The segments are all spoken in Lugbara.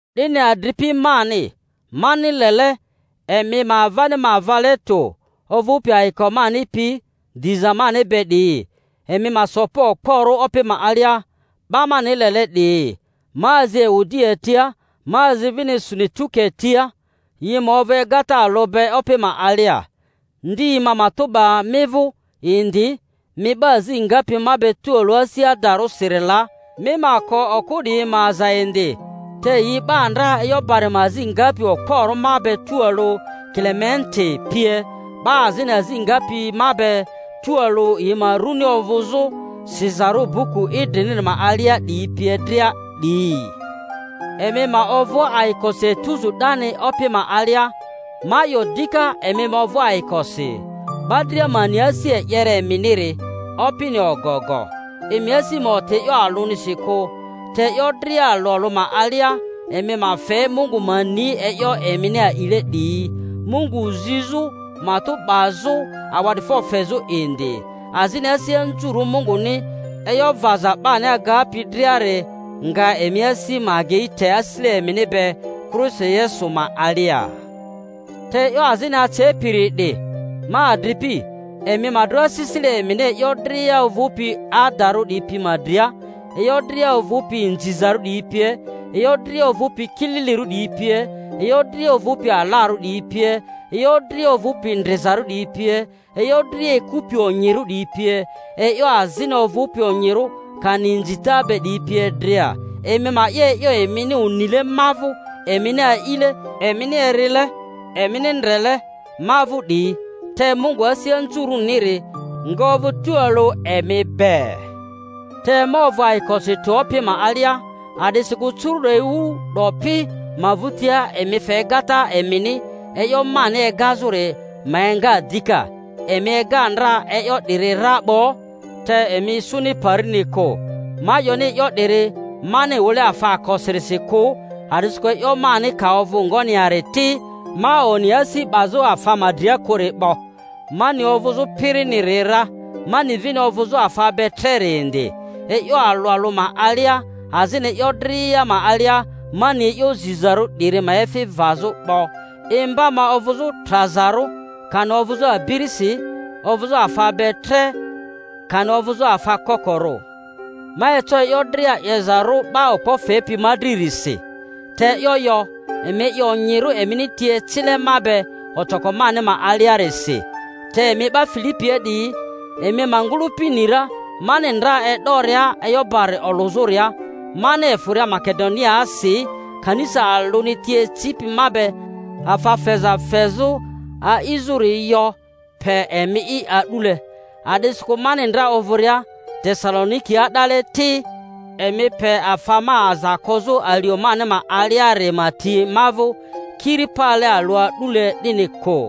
'Dini adripi mani, mani lele, emi ma avani ma vale tᴜ ovᴜpi ayiko mani pi diza mani be 'diyi, emi ma so pa okporᴜ Opi ma alia, 'ba mani lele 'diyi. Ma azi Ewodia tia, ma azi vini Sunituke tia, yi ma ovᴜ egata alᴜ be Opi ma alia. Ndi ma matᴜ 'ba mi vᴜ indi, mi 'ba azi ngapi ma be tualᴜ asi adarᴜsiri la, mi ma ko okᴜ 'diyi ma aza indi; te yi 'ba ndra e'yo bari ma azi ngapi okporᴜ ma be tualᴜ, Kilementi pie, 'ba azini azi ngapi ma be tualᴜ yi ma runi ovᴜzᴜ sizarᴜ buku idriniri ma alia 'diyi pie dria 'diyi. Emi ma ovᴜ ayikosi etuzu 'dani Opi ma alia; ma 'yo dika, Emi ma ovᴜ ayikosi. 'Ba dria ma ni asi e'yere eminiri. Opini ogogo. Emi asi ma oti e'yo alᴜnisi kᴜ, te e'yo dria alᴜ alᴜ ma alia emi ma fe Mungu ma ni e'yo emini a'ile 'diyi, Mungu zizᴜ matᴜ 'bazᴜ awa'difo fezᴜ indi. Azini asi anzurᴜ Munguni e'yo vaza 'bani agapi driari nga emi asi ma agei te asisile emini be Kristo Yesu ma alia. Te e'yo azini acepiri 'di, ma adripi, emi ma dro asisile emini e'yo dria ovᴜpi adarᴜ 'diyi pi ma dria, e'yo dria ovᴜpi inzizarᴜ 'diyi pie, e'yo dria ovᴜpi kililirᴜ 'diyi pie, e'yo dria ovᴜpi alarᴜ 'diyi pie, e'yo dria ovᴜpi ndrizarᴜ 'diyi pie, e'yo dria ekupi onyirᴜ 'diyi pie, e'yo azini ovᴜpi onyirᴜ kani inzita be 'diyi pie dria. Emi ma 'ye e'yo emini onile ma vᴜ, emini a'ile, emini erile, emini ndrele ma vᴜ 'diyi; te Mungu asi anzurᴜniri nga ovᴜ tualᴜ emi be. Te ma ovᴜ ayikosi tᴜ Opi ma alia, a'disikᴜ curu'do ewu 'dopi ma vᴜtia emi fe egata emini e'yo mani egazᴜri ma enga dika; emi ega ndra e'yo 'diri ra 'bo, te emi isuni parini kᴜ. Ma 'yoni e'yo 'diri mani wᴜle afaakosirisi kᴜ; a'disikᴜ e'yo mani ka ovᴜ ngoni yari ti, ma oni asi 'bazᴜ afa ma dria kᴜri 'bo. Ma ni ovᴜzᴜ piriniri ra, ma ni vini ovᴜzᴜ afa be treri indi; e'yo alᴜ alᴜ ma alia azini e'yo dria ma alia, ma ni e'yo zizarᴜ 'diri ma efi vazᴜ 'bo, imba ma ovᴜzᴜ trazarᴜ kani ovᴜzᴜ abirisi, ovᴜzᴜ afa be tre kani ovᴜzᴜ afa kokorᴜ. Ma eco e'yo dria 'yeza-rᴜ 'ba okpo fepi ma dririsi. Te e'yo yo, emi 'ye onyirᴜ emini ti ecile ma be ocoko mani ma aliarisi. Te emi 'ba Filipia 'diyi, emi ma ngᴜlᴜpi ni ra, mani ndra e'doria e'yo bari olᴜzᴜria, mani efᴜria Makedoniaasi, kanisa alᴜni ti ecipi ma be afa feza fezᴜ a'izᴜri yo pe emi'i a'dule; a'disikᴜ mani ndra ovᴜria Tesalonikia 'dale ti, emi pe afa ma aza kozᴜ alio mani ma aliari ma ti ma vᴜ kiri pale alᴜ a'dule 'dini kᴜ.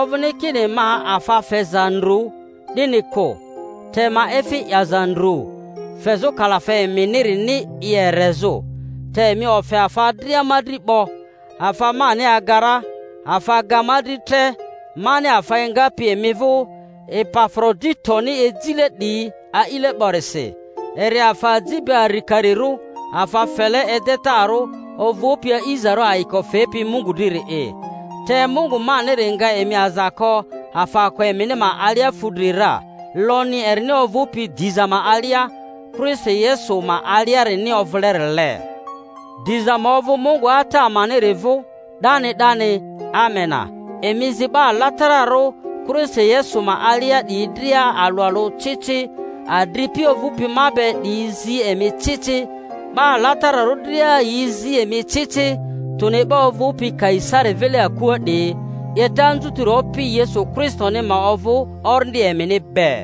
Ovᴜni kini ma afa feza ndru, 'dini kᴜ; te ma efi 'yaza ndru, fezᴜ kalafe eminirini i erezᴜ. Te emi ofe afa dria ma dri 'bo, afa mani aga ra; afa ga ma dri tre, mani afa engapi emi vᴜ Epafroditoni ejile 'diyi a'ile 'borisi, eri afa aji be arikarirᴜ, afa fele edetaro ovᴜpi a'izarᴜ, ayiko fepi Mungu driri'i. Te Mungu maniri nga emi aza ko afaako emini ma alia fudri ra, lonyi erini ovᴜpi diza ma alia Kristo Yesu ma aliarini ovᴜlerile. Diza ma ovᴜ Mungu Ata amaniri vᴜ 'dani 'dani. Amena. Emi zi 'ba alatararᴜ Kristo Yesu ma alia 'diyi dria alᴜ alᴜ ci ci. Adripi ovᴜpi ma be 'diyi zi emi ci ci. 'Ba alatararᴜ dria yi zi emi ci ci, tᴜni 'ba ovᴜpi Kaisari vile akua 'diyi. 'Yeta anzutiri Opi Yesu Kristoni ma ovᴜ orindi emini be.